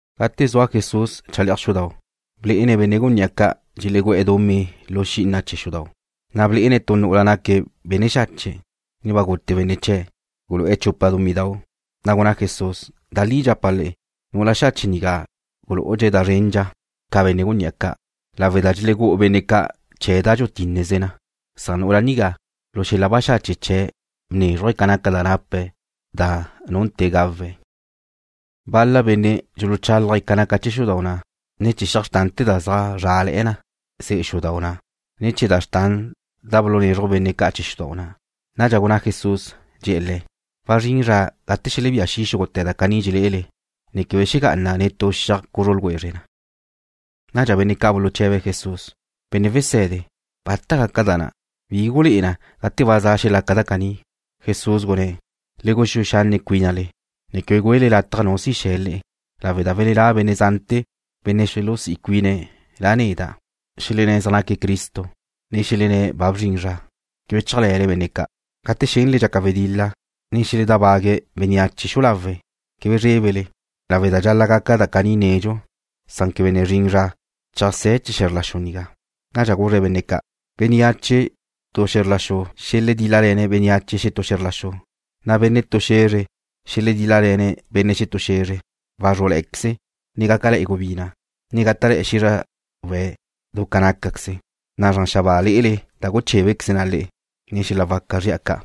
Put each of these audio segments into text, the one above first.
Gate zua Jesús chale'aj xudau', blé'ene̱' benne' gunní'a ca' dxelegú'e̱ dumí lu xí'ina chee̱ xudau'. Na' blé'ene̱' tu nu'ula naque̱' benne' xache', ne ba gute benne' chee̱', gulu'e̱ chupa dumídau'. Na' gunná Jesús: ―Da li dxapa' le'e, nu'ula xache' nigá gulú'udxe̱' da zrendxa ca benne' gunní'a caní, lawe' da dxelegú'u benne' ca' chee̱ da dxutínneze na, san nu'ula nigá, lu xel-la baxache' chee̱' bnézruje̱' ca naca da nape̱' da nunte̱ gawe̱'. Bal-la benne' dxuluchálaje̱' ca naca chee̱ xudau' na', ne chee̱ xiaj xrtante̱ da zaj zrále̱'e̱ na ze'e xudau' na', ne chee̱ da xrtan da bulunezruj benne' chee̱ xudau' na'. Nadxa gunná Jesús, dxe̱'e̱ le̱': ―Wazrín zra gate xelebía xi' xúgute̱ da caní dxelé'ele, ne quebe xegá'ana netú xiaj cuzru ljwezre na. Nadxa benne' ca' buluche̱be̱' Jesús: ―Benne' Wese̱de, ¿bata gaca da na'? ¿Bi gulé'e na gate ba za xelaca da caní? Jesús gunné̱': ―Le guxúe xanne' cuínale, ne quebe güele lataj nu si xe̱ le'e, lawe' da xelelá' benne' zante̱ benne' xulusí' cuine̱' La' neda', xelenné̱' zaj naque̱' Cristo, ne xelenné̱' ba bzrin zra. Quebe chéajle̱le benne' ca'. Gate xénele dxaca wedil-la, ne xeledábague̱' bénneache xu'u lawe', quebe zrébele, lawe' da dxal-la' gaca da caní nedxu, san quebe ne zrin zra cheajsé̱ chee̱ xe̱zr la xu nigá. Nadxa guzre̱' benne' ca': ―Bénneache tu xe̱zr la xu xeledíl-lale̱ bénneache xetú xe̱zr la xu, na' benne' tu xe̱zre xeledíl-lale̱ benne' xetú xe̱zre. Wazrú'le̱'e̱queze, ne gácale̱'e̱ gubina', ne gáta'le̱'e̱ xízrawe̱' du ca nácaqueze, na' zran xabáa lé'ele da guchébequeze na le'e, ne xel-la waca zri'a ca'.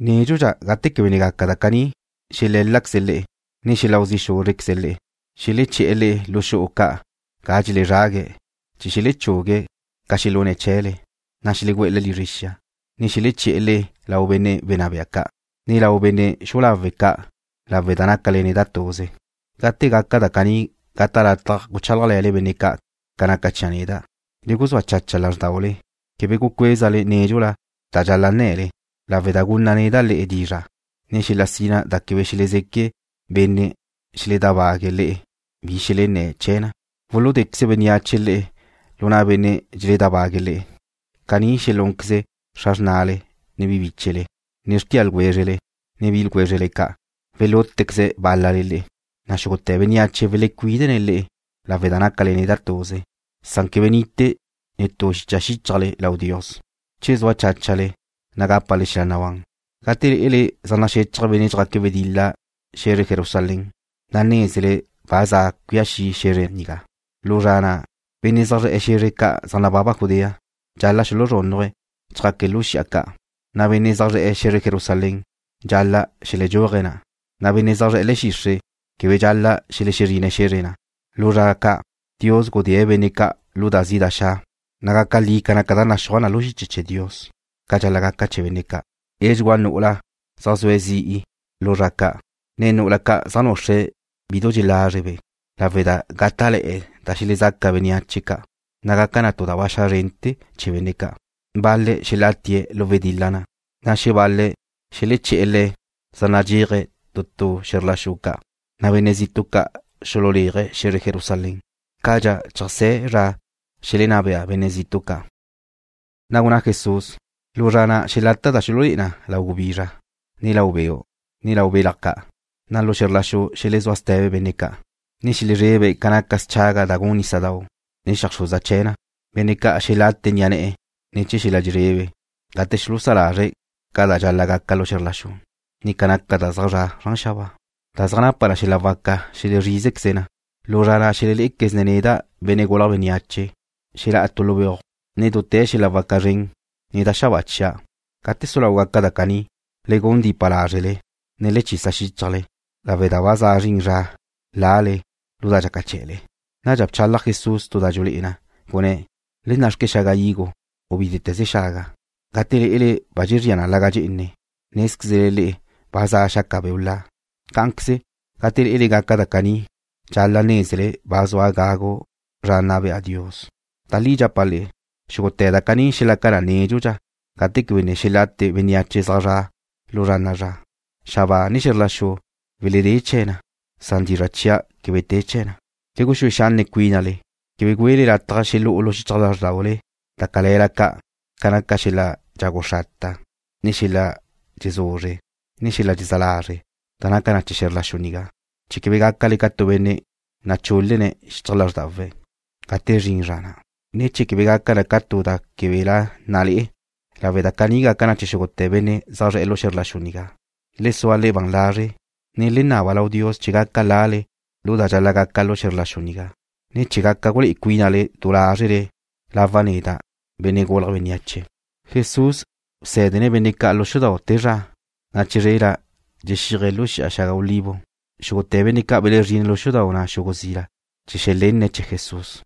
’Nédxudxa gate quebe ne gaca da caní xelé̱laqueze̱' le'e, ne xeláu zi' xúzrequeze̱' le'e. Xeleché̱'e̱ le'e lu xu'u ca' ga dxelezrague̱' chee̱ xelechugue̱' ca xelune̱' chee̱le, na' xelegú'e̱ le'e lizre xia, ne xeleché̱'e̱ le'e lau benne' wenná bea ca', ne lau benne' xu'u lawe' ca' lawe' da nácale neda' tuze. Gate gaca da caní gata' lataj guchálajle̱le benne' ca' ca naca chia' neda'. Le guzúa chacha lázrdaule, quebe gucuézale nédxula da dxal-la' nne̱le, lawe' da gunna' neda' le'e dizra', ne xel-la sina da quebe xelezeque benne' dxeledábague̱' le'e bi xelenné̱' chee̱ na. Wuludéqueze bénneache le'e lu na' benne' dxeledábague̱' le'e. Caní xelúnqueze xra xrnale, ne bi bíchele, ne xrtia ljwézrele, ne bi ljwézrele ca'. Welútequeze̱' bál-lale le'e, na' xúgute̱ bénneache welecuídene̱' le'e lawe' da nácale neda' tuze, san quebe nite tu xicha xíchajle lau Dios. Che sua cháchale, na' gápale xel-la nabán. ’Gate lé'ele zaj naxechaj benne' dxjaque̱' wedil-la xe̱zre Jerusalén, na' nézele ba za cuía xi' xe̱zre nigá. Lu zra na', benne' zaj zre̱'e̱ xe̱zre ca' zaj nababa Judea dxal-la' xuluzrúnnuje̱' chjaque̱' lu xi'a ca', na' benne' zaj zre̱'e̱ xe̱zre Jerusalén dxal-la' xeledxúaje̱' na', na' benne' zaj zre̱'e̱ le̱'e̱ xixre' quebe dxal-la' xelexezrine̱' xe̱zre na'. Lu zra ca' Dios gudée̱' benne' ca' lu da zi' da xa', na' gaca li ca naca da naxúaj na lu xiche chee̱ Dios ca dxal-la' gaca chee̱ benne' ca'. Edxugúa nu'ula zaj zue̱' zi'i lu zra ca', ne nu'ula ca' zaj nuxre̱' bidu dxelázrebe', lawe' da gáta'le̱'e̱ da xelezaca bénneache ca', na' gaca tu da ba xa' zrente̱ chee̱ benne' ca'. Bal-le̱' xelatie̱' lu wedil-la na', na' xebal-le̱' xeleché̱'e̱ le̱' zaj nadxéaje̱' tu tu xe̱zr la xu ca', na' benne' zitu' ca' xululéaje̱' xe̱zre Jerusalén cadxa cheajsé̱ chee̱ zra xelenná bea benne' zitu' ca'. Na' gunná Jesús: ―Lu zra na' xelata' da xululé'e na lau gubizra, ne lau beu', ne lau belaj ca', na' lu xe̱zr la xu xelezúa ste̱be benne' ca', ne xelezrebe̱' ca naca schaga' da gun nísadau', ne xeajxruza chee̱ na. Benne' ca' xelate ni'a ne̱'e̱ ne̱ chee̱ xel-la dxelezrebe gate xulusá lazre̱' ca da dxal-la' gaca lu xe̱zr la xu, ne ca naca da zaj zra' zran xabáa, da zaj napa xel-la waca xelezrízequeze na. Lu zra na' xelelé'equezne̱' neda', Benne' Gulje̱' Bénneache, xelá'a tu lu beuj, nen dute̱ xel-la waca zren, ne da xabáa chia'. Gate su lau gaca da caní, le gun dipa lázrele, ne le chisa xíchajle, lawe' da ba za zrin zra lale lu da dxaca chee̱le. Nadxa bchalaj Jesús tu da dxulé'e na, gunné̱': ―Le nna'xque xaga higo, u bítete̱ze xaga. Gate lé'ele ba dxezría na laga' dxe'ene, nézquezle le'e ba za xaca beu' la. Cá'anqueze, gate lé'ele gaca da caní, dxal-la' nézele ba zua gagu zra nna bea Dios. ’Da li dxapa' le'e, xúgute̱ da caní xelaca na nédxudxa gate quebe ne xelate bénneache zaj zra' lu zra na'a zra. Xabáa, ne xe̱zr la xu weledé chee̱ na, san dizra' chia' quebe te chee̱ na. Le guxúe xanne' cuínale, quebe güele lataj xelú'u lu xichaj lázrdaule da cale̱la ca' ca naca xel-la dxagu xrata, ne xel-la dxezuzre, ne xel-la dxezá lazre' da naca chee̱ xe̱zr la xu nigá, chee̱ quebe gácale ca tu benne' nachúl-lene̱' lu xichaj lázrdawe̱' gate zrin zra na', ne chee̱ quebe gaca na ca tu da que̱la na le'e, lawe' da caní gaca chee̱ xúgute̱ benne' zaj zre̱'e̱ lu xe̱zr la xu nigá. Le sua le'e ban lazre', ne le naba lau Dios chee̱ gaca lale lu da dxal-la' gaca lu xe̱zr la xu nigá, ne chee̱ gaca gulé'e cuínale du lázrele lawa' neda', Benne' Gulje̱' Bénneache. Jesús bsé̱dene̱' benne' ca' lu xudau' te zra, na' chizrela dxexíaje̱' lu Xi'a Xaga Olivo. Xúgute̱ benne' ca' belezrine̱' lu xudau' na' xugu' zila chee̱ xelenne̱' chee̱ Jesús.